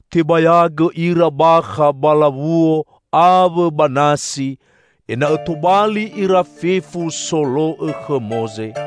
Tebayagõ ira bakha ba lawuo awõ ba nasi ena'õ tobali ira fefu solo'õ khõ Moze.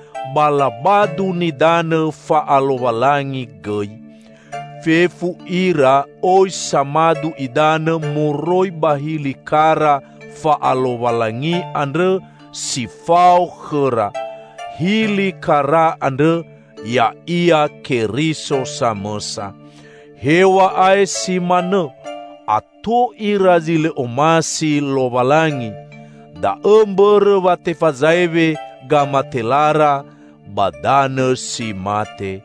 ba labadu nidanõ fa'alowalangi gõi. Fefu ira oi samadu idanõ moroi ba hili kara fa'alowalangi andrõ si fao khõra; hili kara andrõ ya'ia Keriso samõsa. Hew̃a'ae si manõ, ato ira zi lõ omasi Lowalangi, da'õ mbõrõ wa tefazaewe gamatelara ba danõ si mate.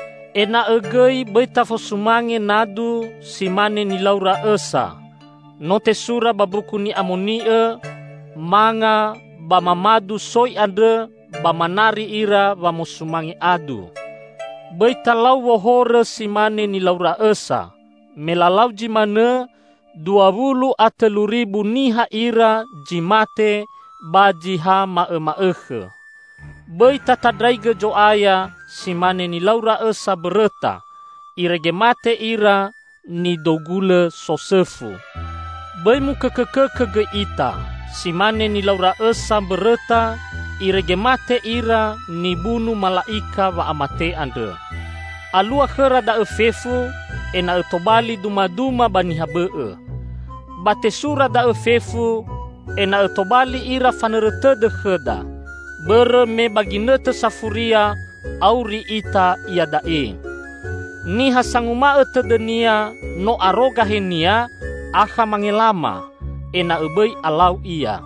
Ena'õ gõi bõi tafosumange nadu si mane nilaura õsa. No tesura ba Mbuku Ni'amoni'õ, "Manga ba mamadu soi andrõ, ba manari ira wamosumange adu." Bõi talau wohorõ si mane nilaura õsa. Me lalau zi manõ, dua wulu a tõlu ribu niha ira zi mate ba zi ha ma'õma'õkhõ. Bõi tatandraigõ Zo'aya si mane nilaura õsa mbõrõta, irege mate ira nidou gulõ sosõfu. Bõi mukõkõkõkõ gõi ita; si mane nilaura õsa mbõrõta irege mate ira nibunu Mala'ika Wa'amate andrõ. Alua khõra da'õ fefu ena'õ tobali dumaduma ba niha bõ'õ. Ba tesura da'õ fefu ena'õ tobali ira fanõrõ tõdõ khõda. Bõrõ me ba ginõtõ safuria auri ita iada'e. Niha sanguma'õ tõdõnia no aro gahenia, akha mangelama; ena'õ bõi alau ia.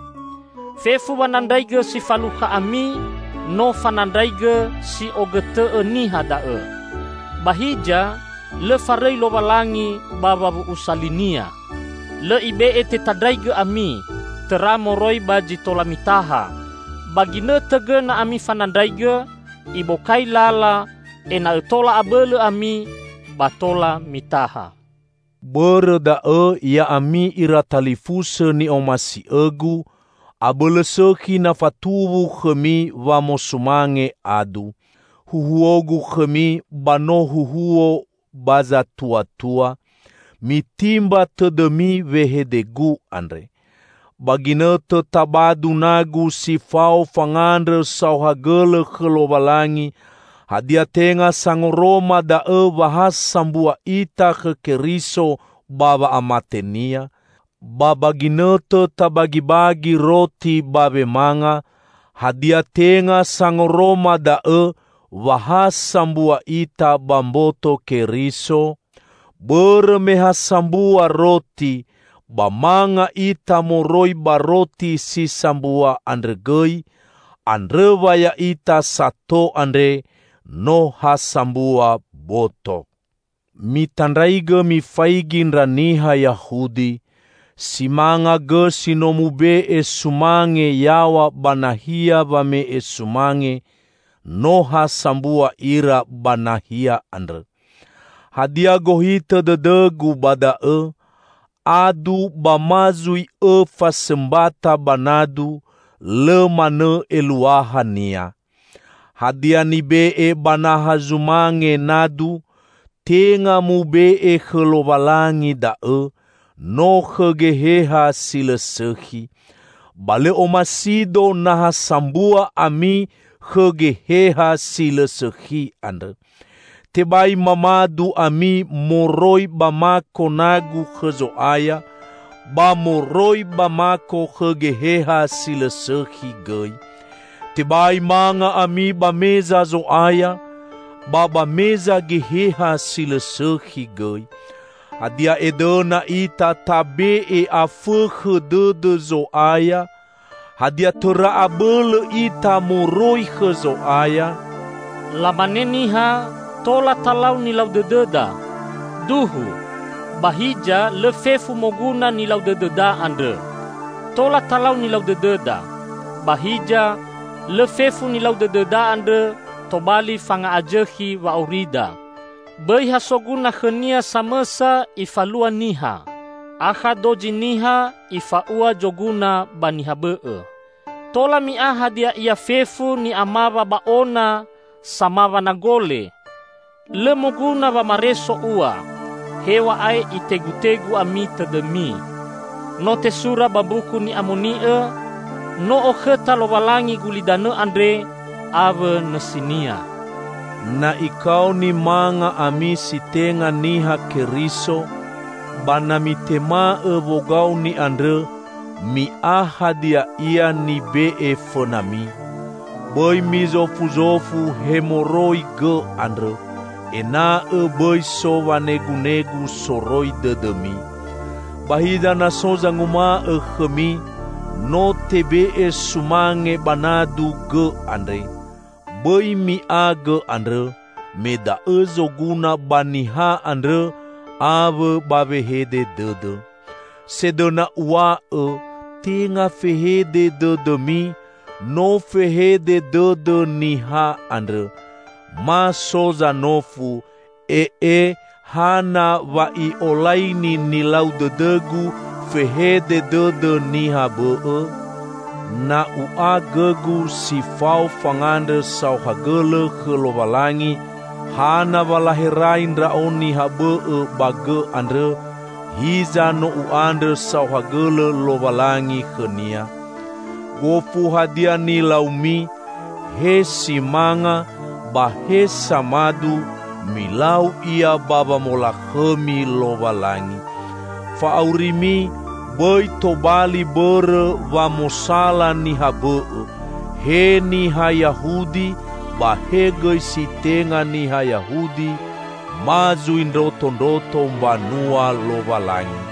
Fefu wanandraigõ si falukha ami no fanandraigõ si'ogõtõ'õ niha da'õ. Ba hiza lõ farõi Lowalangi ba wawu'usa li-Nia. Lõ Ibe'e tetandraigõ ami, tõra moroi ba zi tola mitaha. Ba ginõtõ gõna ami fanandraigõ, Ibokai lala ena'õ tola abõlõ ami ba tola mitaha. Bõrõ da'õ, ya'ami iratalifusõ ni'omasi'õgu, abõlõ sõkhi na fatuwu khõmi wamosumange adu. Huhuogu khõmi ba no huhuo ba zatuatua. Mitimba tõdõmi wehedegu andre. Ba ginõtõ tabadu nagu si fao fangandrõ saohagõlõ khõ Lowalangi, hadia tenga sangoroma da'õ wa ha sambua ita khõ Keriso ba wa'amate-Nia? Ba ba ginõtõ tabagibagi roti ba wemanga, hadia tenga sangoroma da'õ wa ha sambua ita ba mboto Keriso? Bõrõ me ha sambua roti, ba manga ita moroi ba roti si sambua andrõ gõi, andrõ wa ya'ita sato andre no ha sambua boto. Mitandraigõ mifaigi ndra niha Yahudi. Si manga gõ si no mube'e sumange yaw̃a ba nahia wame'e sumange, no ha sambua ira ba nahia andrõ. Hadia gohitõ dõdõgu ba da'õ? Adu ba ma zui õ fasõmbata ba nadu lõ manõ eluahania. Hadia nibe'e ba naha zumange nadu, tenga mube'e khõ Lowalangi da'õ, no khõ geheha si lõ sõkhi. Ba lõ omasido na ha sambua ami khõ geheha si lõ sõkhi andrõ. Tebai mamadu ami moroi ba mako nagu khõ Zo'aya, ba moroi ba mako khõ geheha si lõ sõkhi gõi. Tebai manga ami ba meza Zo'aya, ba ba meza geheha si lõ sõkhi gõi. Hadia edõna ita tabe'e afõkhõ dõdõ Zo'aya? Hadia tõra abõlõ ita moroi khõ Zo'aya? Lamane niha, "Tola talau nilau dõdõda." Duhu! Ba hiza lõ fefu moguna nilau dõdõda andrõ. "Tola talau nilau dõdõda" -- ba hiza lõ fefu nilau dõdõda andrõ tobali fanga'azõkhi wa'aurida. Bõi ha soguna khõnia samõsa ifalua niha. Akha dozi niha ifa'ua zoguna ba niha bõ'õ. Tola mi'a hadia ia fefu ni'amawa ba ona samawa nagole. Lõ moguna wamareso ua, hew̃a'ae itegutegu ami tõdõmi. No tesura ba Mbuku Ni'amoni'õ, "No okhõta Lowalangi gulidanõ andre awõ nõsinia." Na ikaoni manga ami si tenga Niha Keriso, ba na mitema'õ wogaoni andrõ, mi'a hadia ia nibe'e fõnami. Bõi mizofuzofu he moroi gõ andrõ, ena'õ bõi so wanegunegu soroi dõdõmi. Ba hiza na so zanguma'õ khõmi, "No tebe'e sumange ba nadu gõ andre," bõi mi'a gõ andrõ, me da'õ zoguna ba niha andrõ awõ ba wehede dõdõ. Sedõna uw̃a'õ, tenga fehede dõdõmi, no fehede dõdõ niha andrõ. Ma so zanofu, "Ee, hana wa i'olaini nilau dõdõgu fehede dõdõ niha bõ'õ? Na u'a gõgu si fao fangandrõ saohagõlõ khõ Lowalangi, hana wa laherai ndra'o niha bõ'õ ba gõ andrõ, hiza no u'andrõ saohagõlõ Lowalangi khõnia?" Gofu hadia nilaumi -- he si manga ba he samadu -- milau ia ba wamolakhõmi Lowalangi. Fa'aurimi bõi tobali bõrõ wa mosala niha bõ'õ; he niha Yahudi ba he gõi si tenga niha Yahudi, ma zui ndrotondroto mbanua Lowalangi.